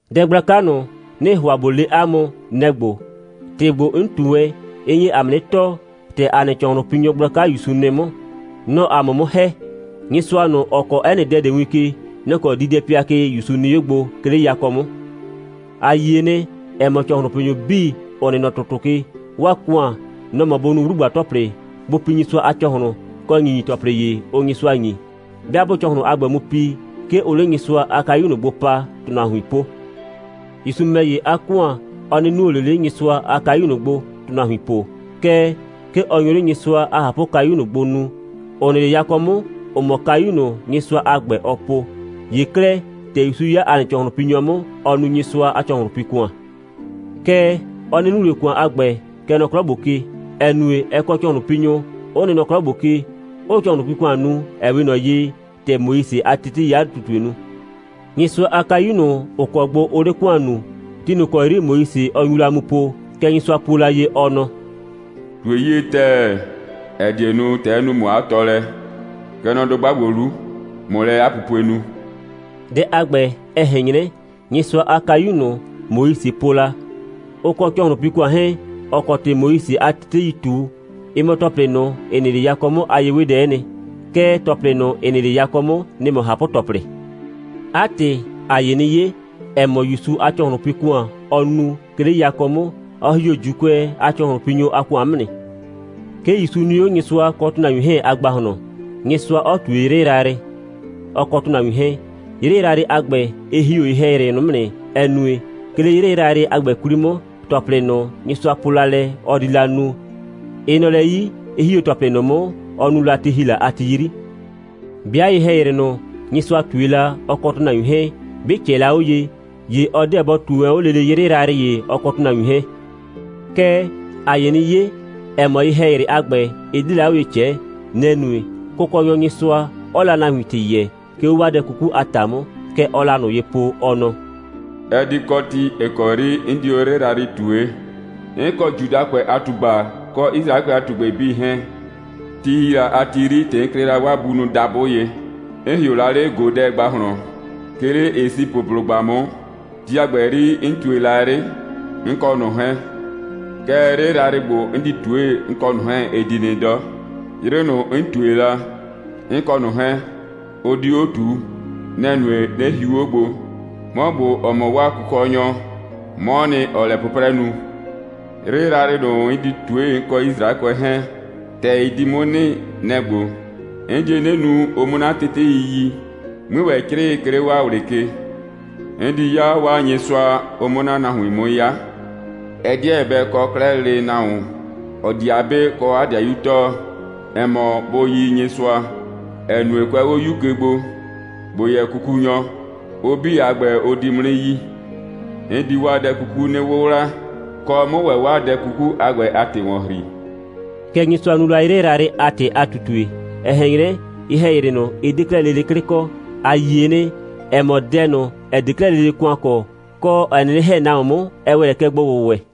Dɛ gblaka ꞊nʋ, 'nɩɩ ‑hʋa ꞊bo le 'a mʋ, nɛ‑ ‑gbo: ‑Tɩ ‑gbo, 'n ꞊tu wɛn, ɩ nye ‑a mʋ 'nɩ tɔɔ, ‑tɛ ‑a nɩ ‑cɔhlʋnpinyɔ gblaka ‑Yusu nɩ 'mʋ. Nɔ‑ɔ ‑a mʋ 'mʋ ‑hɛ. Nyɩsʋa ꞊nʋ, ‑ɔ kɔɔ 'ɛ nɩ dɛ ꞊de win ke, nɔ‑ kɔ diidɛpɩa ke ‑Yusu nɩ 'o gbo, 'ke 'le yakɔ 'mʋ. ‑A yie nɩ, ‑ɛ mɔ, ‑cɔhlʋnpinyʋ 'bii, ‑ʋ nɩ nɔ ‑tʋtʋ ke, 'waa ‑kʋan, nɔ‑ mɔ, bʋ nu 'wlugba‑tɔplɩ, bʋ pi Nyɩsʋa a ‑cɔhlʋn, kɔ ‑nyinyi‑tɔplɩ ‑ye, ʋʋ Nyɩsʋa ‑nyi. 'Bɩa 'bʋʋ ‑cɔhlɩn a ‑gbɛ mu pi, 'ke ʋʋ 'le Nyɩsʋa a kayu ꞊nʋ gbo pa, ‑tʋnahuin po. ‑Yusu ‑mɛ ‑ye, 'a ‑kʋan, ɔ 'nɩ nuo ꞊le 'le Nyɩsʋa a kayu ꞊nʋ gbo, ‑tʋnahuin po. Kɛɛ, 'ke ɔ nyo 'le Nyɩsʋa a ꞊hapʋkayu ꞊nʋ gbo nuu, ‑ʋ nɩ 'le yakɔ 'mʋ, ‑ʋ mɔ kayu ꞊nʋ, Nyɩsʋa a ‑gbɛ, ɔ po. ‑Ye 'klɛɛ, ‑tɛ ‑Yusu 'ya ‑a nɩ ‑cɔhlʋnpinyɔ 'mʋ, ɔɔ nu Nyɩsʋa a ‑cɔhlʋnpi‑kʋan. Kɛɛ, ɔ 'nɩ nu ꞊le ‑kʋan a ‑gbɛ, kɛ nɔ 'klɔ ‑gbo ke, ‑ɛ nue, ɛ kɔ ‑cɔhlʋnpinyʋ, 'ʋ nɩ nɔ 'klɔ ‑gbo ke, 'ʋʋ ‑cɔhlʋnpi‑kʋan nu, ‑ɛ 'we ꞊nɔ ye, ‑tɛ Moise a teteii 'a ꞊tutue nu. Nyɩsʋa a kayu ꞊nʋ, ‑ʋ kɔ gbo ʋʋ 'le ‑kʋan nuu, ti ꞊nʋ ‑kɔ 'yri Moise nyu la 'o mu poo, kɛ Nyɩsʋa puo la ye, ɔ nɔ: «꞊Tue 'yie ‑tɛɛ, ‑ɛ die nu, ‑tɛ 'n nu ‑mʋ 'a tɔɔlɛ, kɛ nɔ dʋgba ‑gbo 'lu, ꞊mʋ lɛ 'a pupue nu.» Dɛ a ‑gbɛ, ɛ ꞊hɛn 'nyrɛ, Nyɩsʋa a kayu ꞊nʋ, Moise po la, ʋ kɔ ‑cɔhlʋnpi‑kʋan 'hɛɛn, ‑ɔ kɔ ‑tɩ Moise a teteii ꞊tu, ɩ mɔ ‑tɔplɩ ꞊nʋ, ‑ɩ nɩ 'le yakɔ 'mʋ a ye'wedɛ'ɛ nɩ. Kɛɛ, ‑tɔplɩ ꞊nʋ, ‑ɩ nɩ 'le yakɔ 'mʋ, nɩ‑ mɔ ꞊hapʋ‑tɔplɩ. 'A ‑tɩ, ‑a nye 'nɩ 'ye, ‑ɛ mɔ, ‑Yusu a ‑cɔhlʋnpi‑kʋan, ɔɔ nu, 'ke 'le yakɔ 'mʋ, ɔ ‑hi 'o ‑Juukʋɛ a ‑cɔhlʋnpinyʋ a ‑kʋan 'mʋ nɩ. 'Ke ‑Yusu nɩ 'o Nyɩsʋa kɔ ‑tʋnahuin 'hɛɛn a ‑gbahlɔn, Nyɩsʋa 'ɔ ꞊tue 'yrɩ yrayrɩ, ɔ kɔ ‑tʋnahuin 'hɛɛn. 'Yrɩ yrayrɩ a ‑gbɛ, ɩ ‑hi 'o ye‑hɛyrɩ ꞊nʋ 'mʋ nɩ, ‑ɛ nue, 'ke 'le 'yrɩ yrayrɩ a ‑gbɛ 'kwli 'mʋ, ‑tɔplɩ ꞊nʋ, Nyɩsʋa po la lɛ, ɔ di la nu, ɩ nɔ lɛ 'yi, 'ɩ ‑hi 'o ‑tɔplɩ ꞊nʋ 'mʋ, ɔ nu la ti ‑hi la a ti 'yri. 'Bɩa ye‑hɛyrɩ ꞊nʋ, Nyɩsʋa ꞊tue la, ɔ kɔ ‑tʋnahuin 'hɛɛn, 'bɩ ꞊cɛɛ la 'o ye, ‑ye ɔ 'deɛ bɔ ꞊tue wɛn 'o lele 'yrɩ yrayrɩ ‑ye, ɔ kɔ ‑tʋnahuin 'hɛɛn. Kɛɛ, ‑a nye 'nɩ 'ye, ‑ɛ mɔ, ye‑hɛyrɩ a ‑gbɛ, ɩ 'de la 'o ye ꞊cɛɛ. Nɛ‑ nue, Kʋkɔnyɔ Nyɩsʋa 'ɔɔ la 'a nahuin ‑tɩ yɛɛ, 'ke 'o 'waa dɛ 'kuku a ‑ta 'mʋ. Kɛ ɔɔ la ꞊nʋ ye po, ɔ nɔ: «Ɛ di kɔ ti, ‑ɩ kɔ 'yri 'n di 'o 'yrɩ yrayrɩ ꞊tue, 'n kɔ Judakʋɛ a ꞊tugba kɔ Yisraɛkʋɛ a ꞊tugbɩ 'bii 'hɛɛn. Ti ‑hi la a ti 'yri, ‑tɛ 'n klɩ la 'waa bunʋ dabʋ ye, 'n ‑hɩʋ la 'le ꞊godɛ ‑gbahlɔn, 'ke 'le Esipʋblʋgba 'mʋ, ti a ‑gbɛ 'yri, 'n ꞊tue la 'yrɩ, 'n kɔ ꞊nʋ 'hɛɛn. Kɛɛ, 'yrɩ yrayrɩ ‑gbo, 'n di ꞊tue, 'n kɔ ꞊nʋ 'hɛɛn, ɩ di nɩ 'dɔ. 'Yrɩ ꞊nʋ, 'n ꞊tue la, 'n kɔ ꞊nʋ 'hɛɛn, ʋ 'di 'o ꞊tuu. Nɛ‑ nue, 'nɩ hiu 'o gbo. 'Mɔ ‑gbo, ‑ɔ mɔ 'waa Kʋkɔnyɔ, 'mɔɔ nɩ, ‑ɔɔ lɛ 'pʋprɛ nu. 'Yrɩ yrayrɩ ꞊nʋ, 'n di ꞊tue, 'n kɔ Yisraɛkʋɛ 'hɛɛn, ‑tɛ ɩ di 'mʋ nɩ, nɛ‑ ‑gbo: 'N die 'nɩ nu, ʋ 'mʋ 'na tetei yi, 'mui ‑wɛ 'crɩɩ, 'ke 'le 'waa ꞊wlɩ ke. 'N di 'ya 'waa Nyɩsʋa, ʋ 'mʋ 'na nahuin 'mʋ 'ya. Ɛ 'deɛ bɛ kɔ 'klɛɛ lele nahuon, ‑ɔ di 'a 'be kɔ 'a 'dɩayu tɔɔ, ‑ɛ mɔ, bʋ yi Nyɩsʋa, ‑ɛ nue, kʋɛ 'o 'yu ke gbo, ‑bo yɛ kukunyɔ, ʋ 'bii a ‑gbɛ, ʋ di 'mʋ 'nɩ yi. 'N di 'waa dɛ 'kuku 'nɩ 'wʋwla, kɔ, 'mʋ ‑wɛ 'waa dɛ 'kuku a ‑gbɛ a ‑tɩ ‑wɔn ‑hri.» Kɛ Nyɩsʋa nu la 'yrɩ yrayrɩ a ‑tɩ a ꞊tutue. Ɛ ꞊hɛn 'nyrɛ, ye‑hɛyrɩ ꞊nʋ, ɩ 'de 'klɛɛ lele 'klɩ kɔ. ‑A yie nɩ, ‑ɛ mɔ, dɛ ꞊nʋ, ‑ɛ 'de 'klɛɛ lele ‑kʋan kɔ, kɔ, ‑ɛ 'nɩnɩ ‑hɛ nahuon 'mʋ, ɛ ‑wɛ lɛ kɛ gbo‑wʋwɛ.